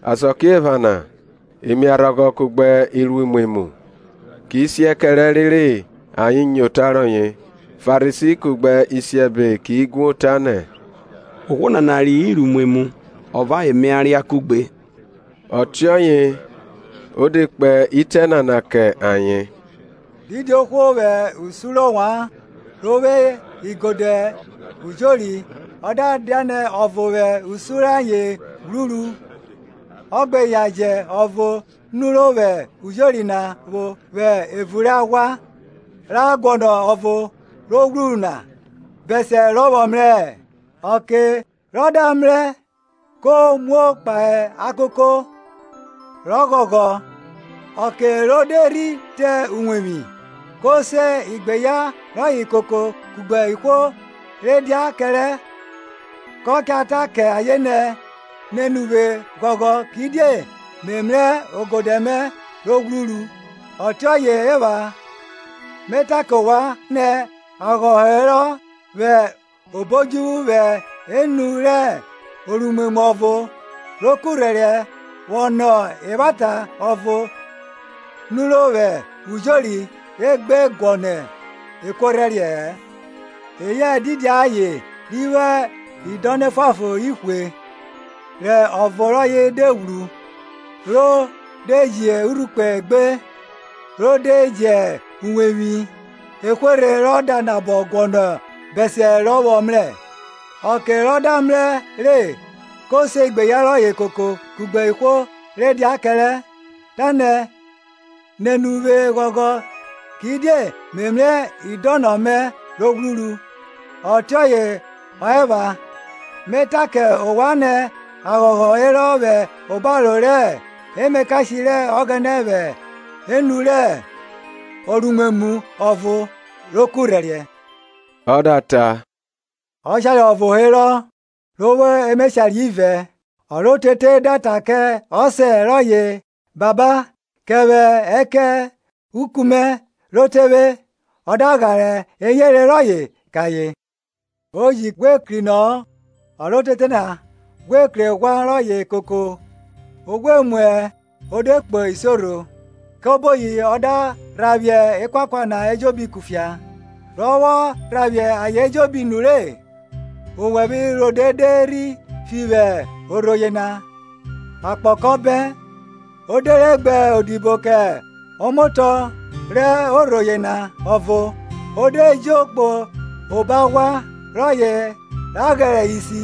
Asakiephana imiarhọghọ kugbe iruimwemwu ki siẹ kẹrẹ rere ayen nyo ota rọye. Farisi kugbe isiẹbe ki guo, tanẹ, Ohwo nana reyọ iruimwemwu ọ vẹ ayen mia ria kuẹgbe. Ọtiọye o de kpe itẹ nana kẹ ayen. Didi ohwo vwẹ usun rẹ ovwan, ro vwo igodẹ ujori, ọ da dianẹ ọvo vwẹ usun rẹ ayen ghwruru, ọ gbe yan jẹ ọvo nuro vwẹ ujori na vwo vwẹ evun rẹ aghwa, ra guọnọ ọvo ro ghwruru na, bẹsiẹ rọ vwọ mrẹ? Ọke rọ da mrẹ re, ko muo kpahe akoko, rọ ghọghọ. Ọke ro de rhi te uwevwi, ko se igbeyan rọye koko kugbe ihwo re dia kẹrẹ, kọ ta kẹ ayen nẹ, Nene uvwe ghọghọ, kidie me mrẹ ogodẹ mẹ ro ghwruru. Ọtiọye ọ epha, me ta kẹ ovwan nẹ, aghọghọ herọ vwẹ obo odjuvwu vwẹ enu rẹ oruimwemwu ọvo ro kurhẹriẹ vwọ nọ evwata ọvo nuro vwẹ ujori re gbe guọnọ ekuorhẹriẹ-ẹ. Eyẹ didi aye ri vwo idọnọ efuanfon ihwe, rẹ ọvo rọye de ghwru, ro de ji urhukpẹ egbe rọ de jẹ uwevwi ehwerhe rọ da nabọ guọnọ bẹsiẹ rọ vwọ mrẹ? Ọke rọ da mrẹ re, ko se igbeyan rọye koko kugbe ihwo re dia kẹrẹ, tanẹ, Nene uvwe ghọghọ, kidie me mrẹ idọnọ mẹ ro ghwruru. Ọtiọye ọ epha, me ta kẹ ovwan nẹ, aghọghọ herọ vwẹ obaro rẹ emakashe rẹ Ọghẹnẹ vwẹ enu rẹ oruimwemwu ọvo ro kurhẹriẹ. Ọ da ta, Ọshare ọvo herọ ro vwo emeshare ivẹ; ọ rẹ otete da ta kẹ ọsẹ rọye, Baba, kẹ vwẹ ẹkẹn uku mẹ ro te vwe. Ọ da ghare eyere rọye kẹ ayen. O ji ghwe krinọ-ọ, ọ rẹ otete na ghwe kru eghwa rọye koko o ghwe muẹ o de kpo isiorho, kẹ oboyi ọ da rhaphiẹ ekuakua na ejobi kufia. Rọ vwọ rhaphiẹ ayen ejobi nure, owẹvwe rode de rhi fi vwẹ orho yena, akpọ kọ bẹn. O de re gbe odibo kẹ ọmotọ rẹ orho yena ọvo, o de jo kpo obo aghwa rọye ra ghẹrẹ isi.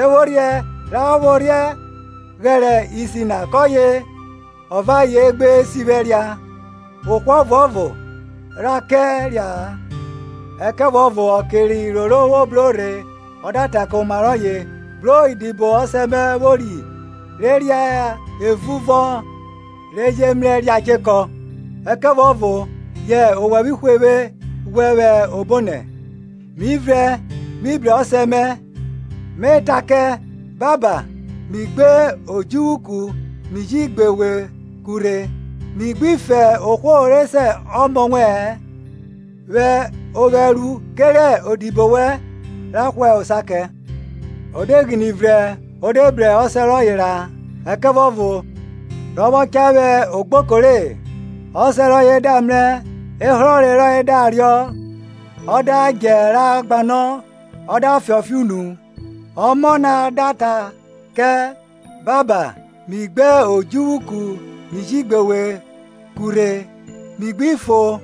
Ephorhienẹ ra vwọ ghẹrẹ isi na kọye ọ vẹ ayen gbe sivwẹ ria; ohwo ọvuọvo rha kẹ ria-a. Ẹkẹvuọvo ọke rẹ iroro vwo bro rhe ọ da ta kẹ oma rọye, Bro idibo ọsẹ mẹ vwori re ria evun vọn re je mrẹ ria chekọ, ẹkẹvuọvo yẹ owẹvwe hwe vwe ghwẹ vwẹ obonẹ. Mi vrẹn mi bru ọsẹ mẹ, me ta kẹ, Baba, mi gbe odjuvwu ku mi ji gbe we ku rhe; mi gbi fo ohwo re se ọmọ wẹ-ẹn, vwẹ ovwẹ ru kerẹ odibo wẹn ra hwa osa kẹ. O de ghine vrẹn o de bru ọsẹ rọye ra. Ẹkẹvuọvo rọ vwọ cha vwe ogboko re; ọsẹ rọye da mrẹ ehrọre rọye da riọ, ọ da djẹ ra gbanọ ọ da fiọnfiọn unu. Ọmọ na da ta kẹ, Baba, mi gbe odjuvwu ku mi ji gbe we ku rhe; mi gbi fo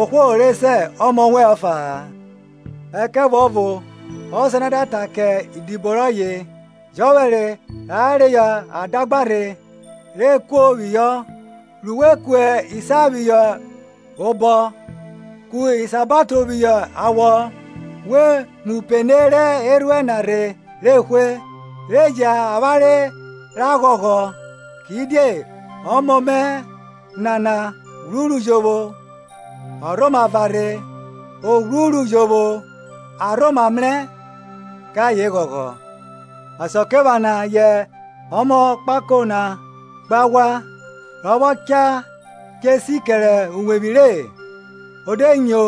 ohwo re se ọmọ wẹn ọfa-a. Ẹkẹvuọvo ọsẹ na da ta kẹ idibo rọye, Jọphẹre ra reyọ adagba rhe, re kuo phihọ, ru we ku isa phihọ obọ, ku isabato phihọ awọ; we mu upene rẹ erhuẹn na rhe re hwe, re jẹn avwanre ra ghọghọ; Kidie ọmọ me nana ghwuru jovwo, ọ rhoma varhe; o ghwruru jovwo, a rhoma mrẹ. Kẹ ayen ghọghọ. Asakiephana yẹ ọmọ kpako na kpo aghwa; rọ vwọ cha che si kẹre uwevwi re, o de nyo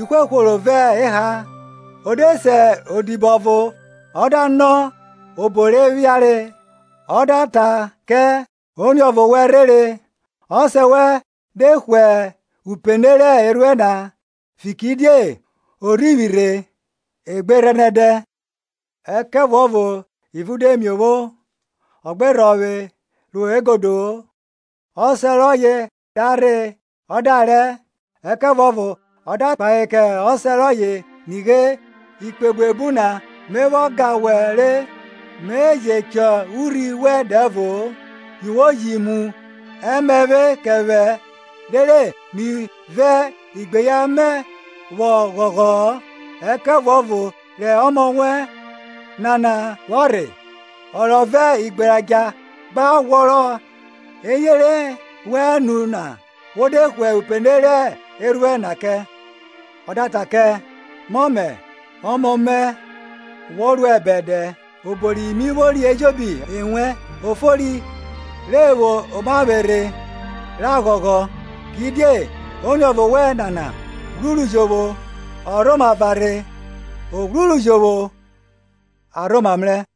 ihwehworo vẹ eha. O de se odibo ọvo ọ da nọ obo re phiare. Ọ da ta kẹ; Oniọvo wẹn rhere, ọsẹ wẹn de hwe upene rẹ erhuẹn na, fikiridie o rhivwi rhe egberhẹnẹdẹ. Ẹkẹvuọvo ivun de miovwo, ọ gbe rhọvwe ro egodo-o. Ọsẹ rọye da rhe ọ da rẹ, ẹkẹvuọvo ọ da kpahe kẹ ọsẹ rọye, Nighe, ikpe buebu na me vwọ ga wẹ re, me je chọ urhi wẹn dẹvo-o; yi wo ji mu ẹmẹvwe kẹ vwẹ, rere me vẹ igbeyan mẹ vwọ ghọghọ-ọ. Ẹkẹvuọvo rẹ ọmọ wẹn nana vwọ rhe, ọ rọ vẹ igberadja gba ghwọrọ eyere wẹn nu na, wo de hwe upene rẹ erhuẹn na kẹ! Ọ da ta kẹ, Mọmẹ, ọmọ mẹ wo ruẹ bẹdẹ, obo ri mi vwori ejobi ewẹn. O fori re vwo omavwerhe ra ghọghọ, kidie oniọvo wẹn nana ghwuru jovwo, ọ rhoma varhe, o ghwruru jovwo, a rhoma mrẹ,